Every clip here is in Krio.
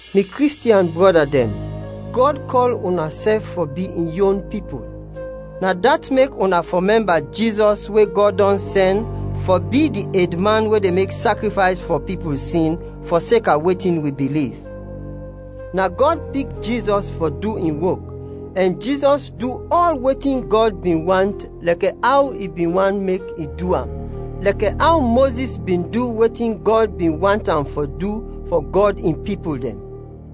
Mi Kristiɛn brɔda dɛn, Gɔd kɔl unasɛf fɔ bi in yon pipul. Na dat mek una fɔ mɛmba Jizɔs we Gɔd dɔn sɛn fɔ bi di edman we de mek sakrifays fɔ pipul sin, fɔseka wetin wi biliv. Na Gɔd pik Jizɔs fɔ du in wok, ɛn Jizɔs du ɔl wetin Gɔd bin want lɛkɛ aw i bin want mek i du am, lɛkɛ aw Mozis bin du wetin Gɔd bin want am fɔ du fɔ Gɔd in pipul dɛn.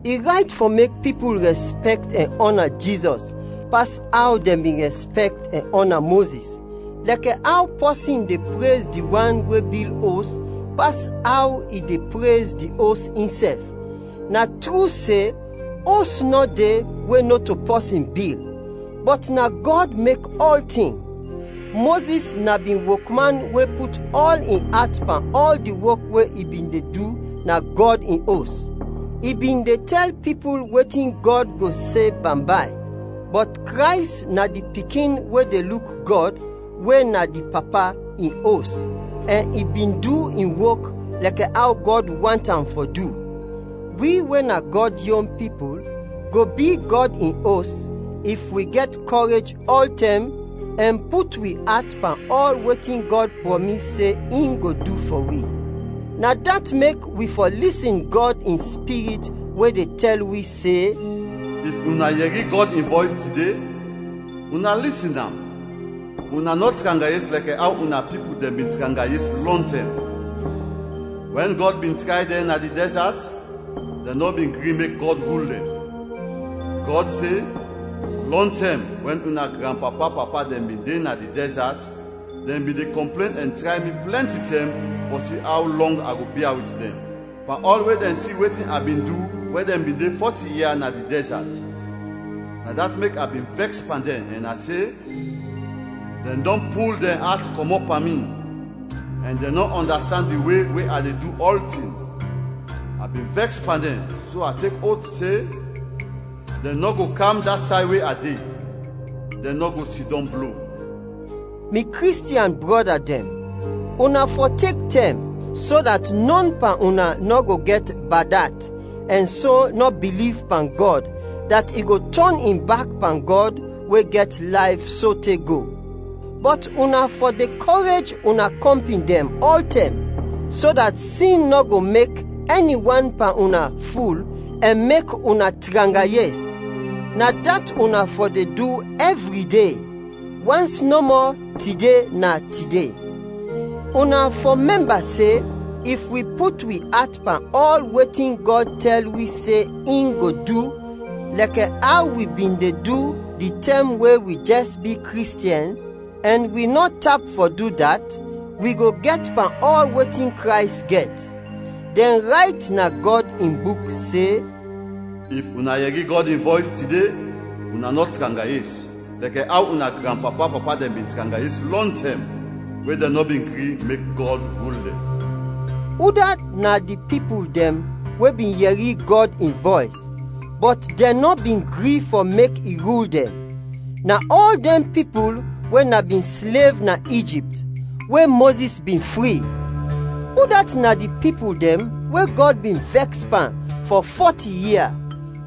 I rayt fɔ mek pipul rɛspɛkt ɛn ɔna Jizɔs pas aw dɛn bin rɛspɛkt ɛn ɔna Mozis, lɛkɛ aw pɔsin de prez di wan we bil os, pas aw i de prez di os insɛf. Na tru se, os nɔ de we nɔto pɔsin bil, bɔt na Gɔd mek ɔltin. Mozis na bin wokman we put ɔl in at pan ɔl di wok we i bin de du na Gɔd in Os. I bin de tɛl pipul wetin Gɔd go se bambay. Bɔt Krays na di Pikin we de luk Gɔd, we na di Papa, in Os, ɛn i bin du in wok lɛkɛ aw Gɔd want am fɔ du. Wi we na Gɔd yon pipul, go bi Gɔd in Os, if wi gɛt kɔrej ɔltɛm ɛn put wi at pan ɔl wetin Gɔd prɔmis se in go du fɔ wi. Na dat mek wi fɔ lisin Gɔd in Spirit we de tɛl wi se, “If una yɛri Gɔd in vɔys tide, una lisin am, una nɔ tranga yes lɛkɛ aw una pipul dɛn bin tranga yes lɔntɛm, wɛn Gɔd bin tray dɛn na di dɛzat, dɛn nɔ bin gri mek Gɔd rul dɛn. Gɔd se, Lɔntɛm, wɛn una granpapa-papa dɛn bin de na di dɛzat, dɛn bin de kɔmplen ɛn tray mi plɛnti tɛm fɔ si aw lɔng a go bia wit dɛn, pan ɔl we dɛn si wetin a bin du wɛn dɛn bin de fɔti ia na di dɛzat. Na dat mek a bin vɛks pan dɛn, ɛn a se, ‘Dɛn dɔn pul dɛn at kɔmɔt pan mi, ɛn dɛn nɔ ɔndastand di we we a de du ɔltin.’ A bin vɛks pan dɛn, so a tek oth se, ‘Dɛn nɔ go kam da say we a de, dɛn nɔ go sidɔm blo!’” Mi Kristiɛn brɔda dɛn, una fɔ tek tɛm, so dat nɔn pan una nɔ go gɛt bad at ɛn so nɔ biliv pan Gɔd dat i go tɔn in bak pan Gɔd we gɛt layf sote go. Bɔt una fɔ de kɔrej una kɔmpin dɛn ɔltɛm, so dat sin nɔ go mek ɛni wan pan una ful ɛn mek una tranga yes. Na dat una fɔ de du ɛvri de, wans nɔmɔ “Tide” na tide. Una fɔ mɛmba se, if wi put wi at pan ɔl wetin Gɔd tɛl wi se in go du lɛkɛ aw wi bin de du di tɛm we wi jɛs bi Kristiɛn, ɛn wi nɔ tap fɔ du dat, wi go gɛt pan ɔl wetin Krays gɛt. Dɛn rayt na Gɔd in Buk se, “If una yɛri Gɔd in vɔys tide, una nɔ tranga yes, lɛkɛ aw una granpapa-papa dɛn bin tranga yes lɔntɛm, we dɛn nɔ bin gri mek Gɔd rul dɛn.” Udat na di pipul dɛn we bin yɛri Gɔd in vɔys, bɔt dɛn nɔ bin gri fɔ mek i rul dɛn? Na ɔl dɛn pipul we na bin slev na Ijipt, we Mozis bin fri. Udat na di pipul dɛn we Gɔd bin vɛks pan fɔ fɔti ia?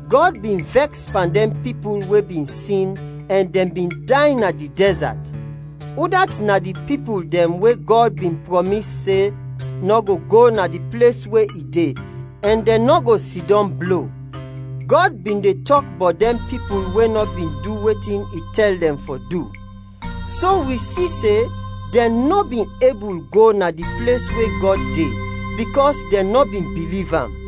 Gɔd bin vɛks pan dɛn pipul we bin sin ɛn dɛn bin day na di dɛzat. Udat na di pipul dɛn we Gɔd bin prɔmis se, nɔ go go na di ples we i de ɛn dɛn nɔ go sidɔm blo? Gɔd bin de tɔk bɔt dɛn pipul we nɔ bin du wetin i tɛl dɛn fɔ du. So, wi si se, dɛn nɔ bin ebul go na di ples we Gɔd de, bikɔs dɛn nɔ bin biliv am.